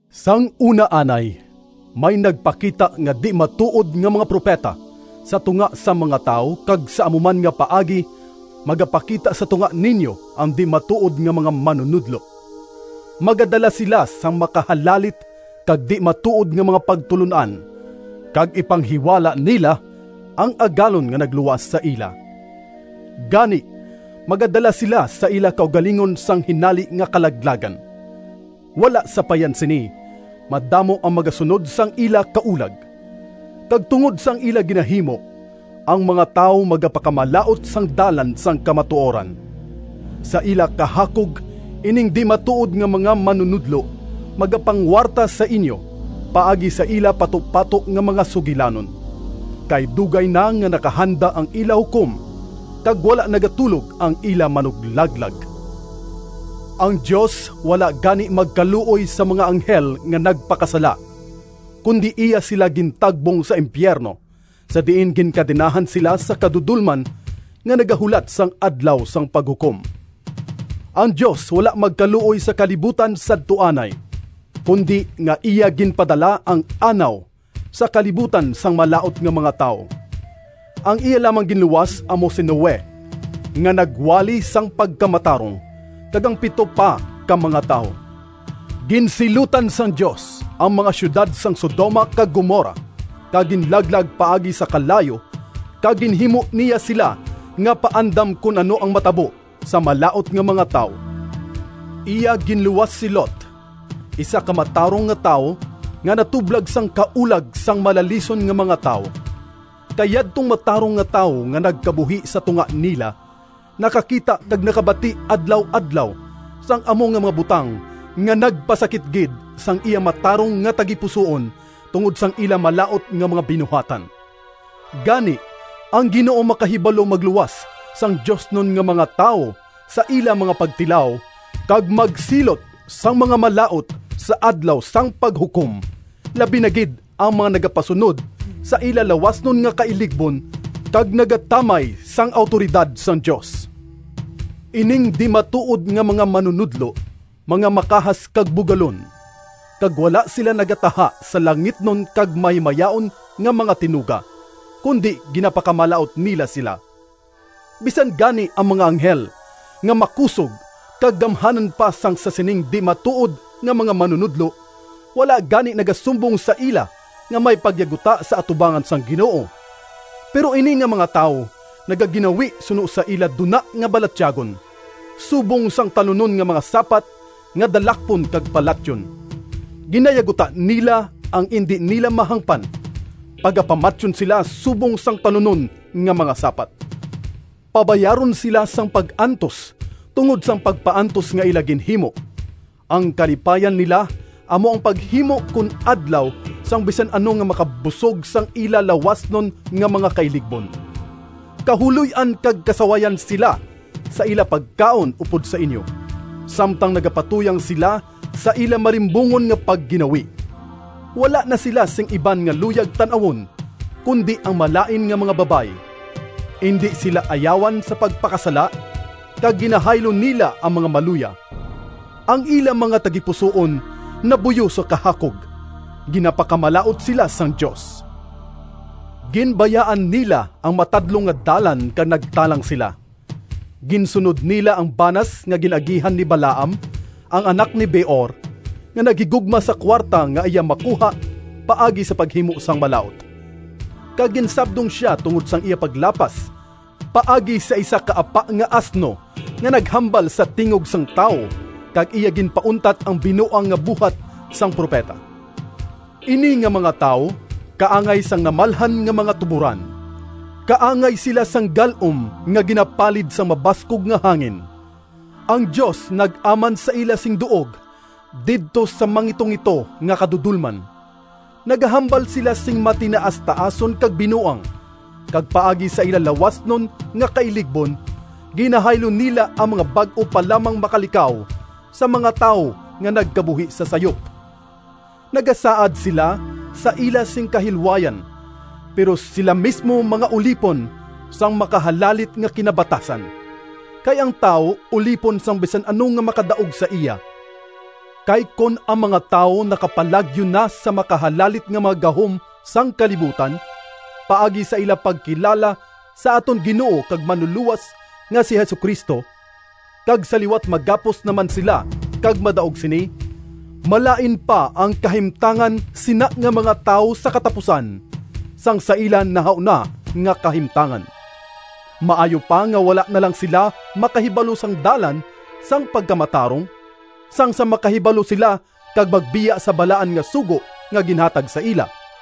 Sang una anay, may nagpakita nga di-matuod nga mga propeta sa tunga sang mga tawo, kag sa amo man nga paagi magapakita sa tunga ninyo ang di-matuod nga mga manunodlo. Magadala sila sang makahalalit kag di-matuod nga mga pagtulon-an, kag ipanghiwala nila ang Agalon nga nagluwas sa ila. Gani magadala sila sa ila kaugalingon sang hinali nga kalaglagan. Wala sapayan sini, madamo ang magasunod sang ila kaulag. Kag tungod sang ila ginahimo, ang mga tawo magapakamalaut sang Dalan sang kamatuoran. Sa ila kahakog ining di-matuod nga mga manunodlo magapangwarta sa inyo paagi sa ila patupato nga mga sugilanon. Kay dugay na nga nakahanda ang ila Hukom, kag wala nagatulog ang ila Manuglaglag! Ang Dios wala gani magkaluoy sa mga anghel nga nagpakasala, kundi iya sila gintagbong sa impiyerno, sa diin ginkadenahan sila sa kadudolman, nga nagahulat sang Adlaw sang Paghukom. Ang Dios wala magkaluoy sa kalibutan sadto anay, kundi nga iya ginpadala ang Anaw sa kalibutan sang malaut nga mga tawo. Ang iya lamang ginluwas amo si Noe, nga nagwali sang pagkamatarong, kag ang pito pa ka mga tawo. Ginsilutan sang Dios ang mga siyudad sang Sodoma kag Gomorra kag ginlaglag paagi sa kalayo, kag ginhimo niya sila nga paandam kon ano ang matabo sa malaut nga mga tawo. Iya ginluwas si Lot, isa ka matarong nga tawo, nga natublag sang kaulag sang malalison nga mga tawo. Kay yadtong matarong nga tawo nga nagkabuhi sa tunga nila, nakakita kag nakabati adlaw-adlaw sang amo nga mga butang nga nagpasakit gid sang iya matarong nga tagipusoon tungod sang ila malaut nga mga binuhatan. Gani, ang Ginoo makahibalo magluwas sang diosnon nga mga tawo sa ila mga pagtilaw, kag magsilot sang mga malaut sa Adlaw sang Paghukom, labi na gid ang mga nagapasunod sa ila lawasnon nga kailigbon kag nagatamay sang awtoridad sang Dios. Ining di-matuod nga mga manunodlo mga makahas kag bugalon, kag wala sila nagataha sa langitnon kag mahimayaon nga mga tinuga, kundi ginapakamalaut nila sila. Bisan gani ang mga anghel nga makusog kag gamhanan pa sang sa sining di-matuod nga mga manunodlo, wala gani nagasumbong sa ila nga may pagyaguta sa atubangan sang Ginoo. Pero ini nga mga tawo nagaginawi suno sa ila duna nga balatyagon, subong sang talunon nga mga sapat nga dalakpon kag palatyon. Ginayaguta nila ang indi nila mahangpan. Pagapamatyon sila subong sang talunon nga mga sapat. Pabayaron sila sang pag-antos tungod sang pagpaantos nga ila ginhimo. Ang kalipayan nila amo ang paghimo kon adlaw sang bisan ano nga makabusog sang ila lawasnon nga mga kailigbon. Kahuloy-an kag kasawayan sila sa ila pagkaon upod sa inyo, samtang nagapatuyang sila sa ila malimbungon nga pagginawi! Wala na sila sing iban nga luyag tan-awon, kundi ang malain nga mga babayi. Indi sila ayawan sa pagpakasala, kag ginahaylo nila ang mga maluya. Ang ila mga tagipusoon nabuyo sa kahakog. Ginapakamalaut sila sang Dios! Ginbayaan nila ang matadlong nga dalan kag nagtalang sila. Ginsunod nila ang banas nga gin-agihan ni Balaam, ang anak ni Beor, nga naghigugma sa kuwarta nga iya makuha paagi sa paghimo sang malaut, kag ginsabdong sia tungod sang iya paglapas, paagi sa isa ka apa nga asno nga naghambal sa tingog sang tawo, kag iya ginpauntat ang binuang nga buhat sang propeta. Ini nga mga tawo kaangay sang namalhan nga mga tuboran. Kaangay sila sang gal-om nga ginapalid sang mabaskog nga hangin. Ang Dios nag-aman sa ila sing duog didto sa mangitungito nga kadudolman. Nagahambal sila sing matinaastaason kag binuang, kag paagi sa ila lawasnon nga kailigbon ginahaylo nila ang mga bag-o pa lamang makalikaw sa mga tawo nga nagkabuhi sa sayop. Nagasaad sila sa ila sing kahilwayan, pero sila mismo mga ulipon sang makahalalit nga kinabatasan, kay ang tawo ulipon sang bisan ano nga makadaog sa iya. Kay kon ang mga tawo nakapalagyo na sa makahalalit nga mga gahom sang kalibutan paagi sa ila pagkilala sa aton Ginoo kag Manlulowas nga si Jesu-Cristo, kag sa liwat magapos naman sila kag madaog sini, malain pa ang kahimtangan sina nga mga tawo sa katapusan, sang sa ila nahauna nga kahimtangan. Maayo pa nga wala na lang sila makahibalo sang dalan sang pagkamatarong, sang sa makahibalo sila kag magbiya sa balaan nga sugo nga ginhatag sa ila!